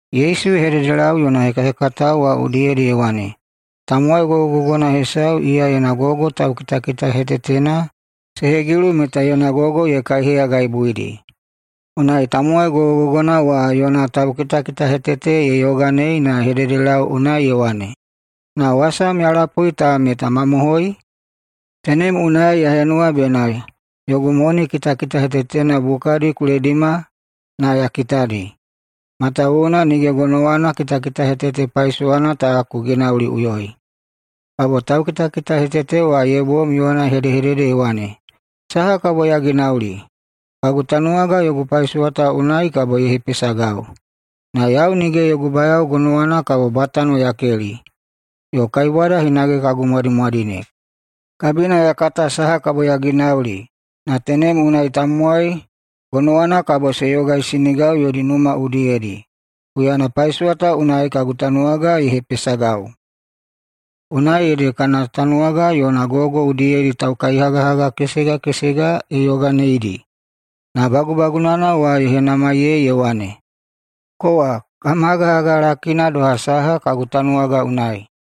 Yesu ye hededelau yona hekahekatao wa udiyedi ye wane, “Tamowai gogogogona hesau iya yona gogo taukitakitahetetena se hegilu meta yona gogo ye kaiheyagaibuidi. Unai tamowai gogogogona wa yona taukitakitahetete ye yoganei na ye hededelau unai ye wane, ‘Na wasam ya lapui ta meta mamohoi? Tenem unai ya henuwa bena yogu moni kitakitahetetena bukadi ku ledima na ya kitadi, matawuwuna nige gonowana kitakitahetete paisowana ta ku ginauliꞌuyoi.’ Kabo taukitakitahetete wa ye bom yona ye hedehedede ye wane, ‘Saha kabo ya ginauli? Kagu tanuwaga yogu paisowa ta unai kabo ye hepesagau, na yau nige yogu bayao gonowana kabo bwatano ya keli, yo kaibwada hinage kagu mwadimwadine. Kabina ya kata saha kabo ya ginauli na tenem unai tamowai gonowana kabo se yogaisinigau yodi numa udiyedi, huyana paisowa ta unai kagu tanuwaga ye hepesagau.’ Unai ede kana tanuwaga yona gogo udiyedi taukaihagahaga kesega kesega ye yoganeidi. Na bagubagunana wa ye henamaiyei ye wane, ‘Kowa kam hagahaga lakina doha saha kagu tanuwaga unai?’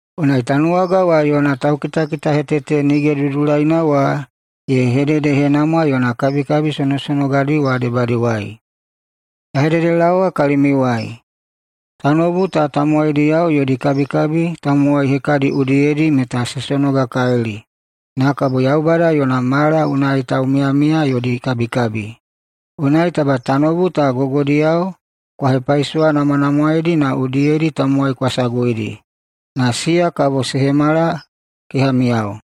Unai tanuwaga wa yona taukitakitahetete nige dudulaina wa ye hededehenamwa yona kabikabi sonosonogadi wa debadiwai. Ya hededelaowa kalimiuwai: Tanoubu ta tamowaidiyao yodi kabikabi tamowai hekadi udiyedi meta se sonogakalili, na kabo Yaubada yona mala unai taumiyamiya yodi kabikabi. Unai taba tanoubu ta gogodiyao kwa hepaisowanamwanamwaedi na udiyedi tamowai kwa saguidi, na siya kabo se hemala kehamiyao.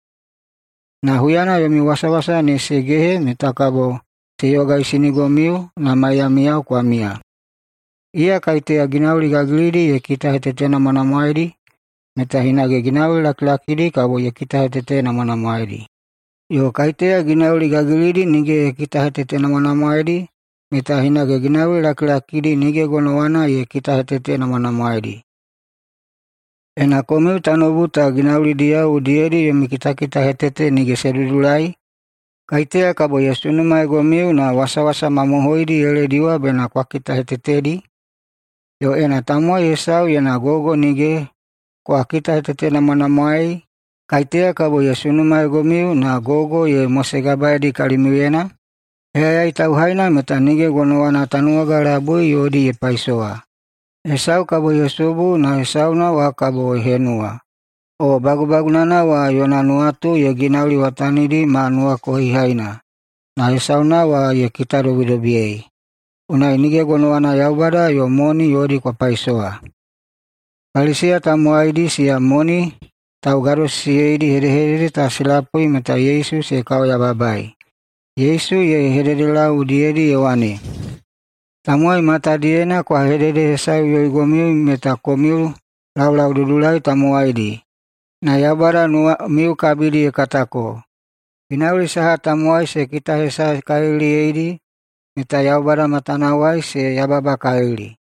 Na huyana yomi wasawasa ne se gehe meta kabo se yogaisinigomiu na maiyamiyao kwa miya. Iya kaiteya ginauli gagilidi ye kitahetetenamwanamwaedi meta hinage ginauli lakilakidi kabo ye kitahetetenamwanamwaedi. Yo kaiteya ginauli gagilidi nige ye kitahetetenamwanamwaedi meta hinage ginauli lakilakidi nige gonowana ye kitahetetenamwanamwaedi. Ena komiu tanoubu ta ginaulidiyao udiyedi yomi kitakitahetete nige se dudulai, kaiteya kabo ye sunumaeigomiu na wasawasa mamohoidi ye lediwa bena kwa kitahetetedi? Yo ena tamowai hesau yona gogo nige kwa kitahetetenamwanamwaei, kaiteya kabo ye sunumaeigomiu na gogo ye mosegabaeidi kalimiuyena? Heyayai tauhaina meta nige gonowana tanuwaga labui yodi ye paisowa. Hesau kabo ye subu na hesauna wa kabo ye henuwa, o bagubagunana wa yona nuwatu ye ginauliwatanidi ma nuwakohihaina, na hesauna wa ye kitadobidobiyei. Unai nige gonowana Yaubada yo moni yodi kwa paisowa.” Paliseya tamowaidi, siya moni taugadosisiyeidi, hedehedede ta se lapui meta Yesu se kaoyababaei. Yesu ye hededelau udiyedi ye wane, “Tamowai matadiyena kwa hededehesaeꞌuyoigomiu meta komiu laulaududulai tamowaidi, na Yaubada nuwamiu kabidi ye katako. Ginauli saha tamowai se kitahesaekaliliyeidi meta Yaubada matanawai se yababakalili.”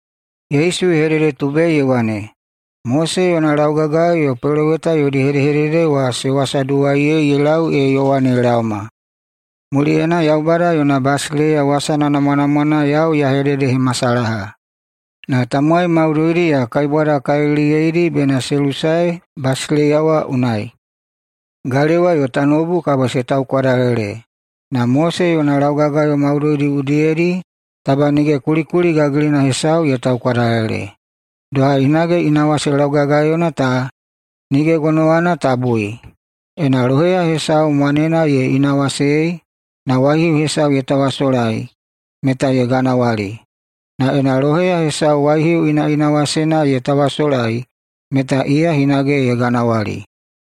[Yesu ye hededetubei ye wane,] “Mose yona laugagayo yo peloweta yodi hedehedede wa se wasaduwaiyeidi ye lau ee Yowane ye laoma. Muliyena Yaubada yona basileiya wasana namwanamwana yau ya hededehemasalaha, na tamowai maudoidi ya kaibwadakaliliyeidi bena se lusae basileiya wa unai. Galewa yo tanoubu ta kabo se taukwadalele, na [Mose yona] laugagayo maudoidi udiyedi taba nige kulikuli gagilina hesau ye taukwadalele. [Doha hinage] inawase laugagayona ta [nige gonowana ta bui]: Ena loheya hesau mwanena ye inawasei na waihiu hesau ye tawasolai, meta ye ganawali. Na ena loheya hesau waihiu inaꞌinawasena ye tawasolai, meta iya hinage ye ganawali.”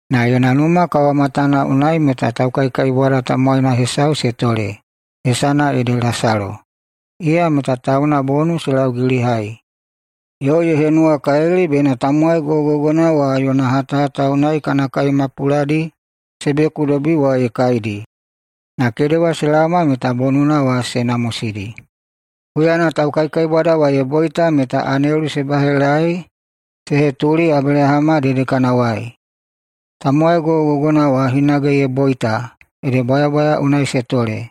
Na yona numa kawamatana unai meta taukaikaibwada tamowaina hesau se tole, hesana ede Lasalo, iya meta tauna bonu se laugilihai yo ye henuwakalili bena tamowai gogogogona wa yona hatahata unai kana kai mapuladi se beku wa ye kaidi. Na kedewa se laoma meta bonuna wa se namosidi. Huyana taukaikaibwada wa ye boita meta anelu se bahelaei se hetuli Abelahama dedekanawai. Tamowai gogogogona wa hinage ye boita ede bwayabwaya unai se tole.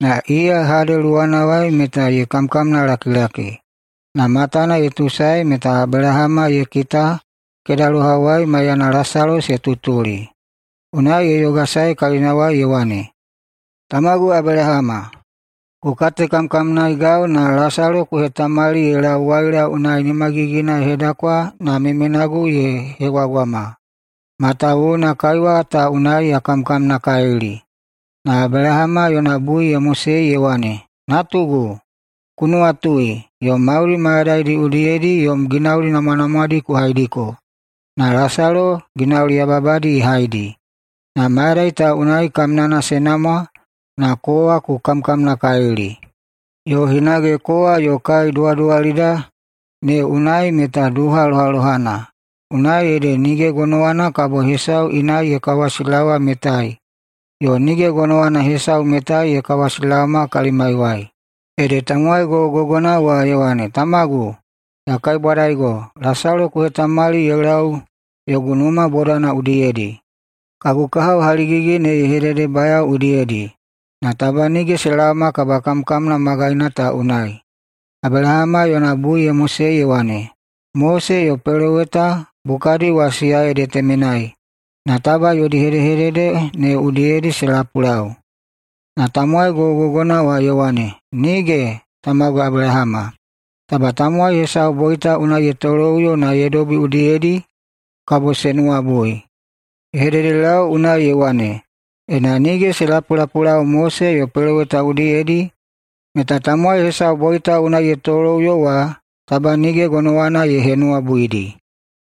Na iya Hade luwana unai meta ye kamkamnalakilaki, na matana ye tuusaedi meta Abelahama ye kita kedalohawai maiyana Lasalo se tutuli. Unai ye yogasae kalinawai ye wane, ‘Tamagu Abelahama, ku katekamkamnaegau na Lasalo ku hetamali ye lau waila unai nimagigina ye hedakwa na memenagu ye hegwagwama, matawuwuna kaiwa ta unai ya kamkamnakalili.’ Na Abelahama yona bui ye mosei ye wane, ‘Natugu, ku nuwatui, yom mauli mayadaidi udiyedi yom ginauli namwanamwadi ku haidiko, na Lasalo ginauli yababadi ye haidi, na mayadai ta unai kamnana se namwa na kowa ku kamkamnakalili. Yo hinage kowa yo kai duwaduwalida ne unai meta duha lohalohana, unai ede nige gonowana kabo hesau inai ye kawasilaowa metai yo nige gonowana hesau metai ye kawasilaoma kalimaiwai.’ Ede tamowai gogogogona wa ye wane, ‘Tamagu, ya kaibwadaigo, Lasalo ku hetamali ye lau yogu numa bodana udiyedi, kagu kahao haligigi ne ye hededebayao udiyedi, na taba nige se laoma kabakamkamna magaina ta unai.’ Abelahama yona bui ye mosei ye wane, ‘Mose yo peloweta bukadi wa siya ede temenai, na taba yodi hedehedede ne udiyedi se lapulau.’ Na tamowai gogogogona wa ye wane, ‘Nige! Tamagu Abelahama, taba tamowai hesau boita unai ye toloꞌuyo na ye dobi udiyedi, kabo se nuwabui.’ Ye hededelau unai ye wane, ‘Ena nige se lapulapulau Mose yo peloweta udiyedi, meta tamowai hesau boita unai ye toloꞌuyo wa taba nige gonowana ye henuwabuidi.’”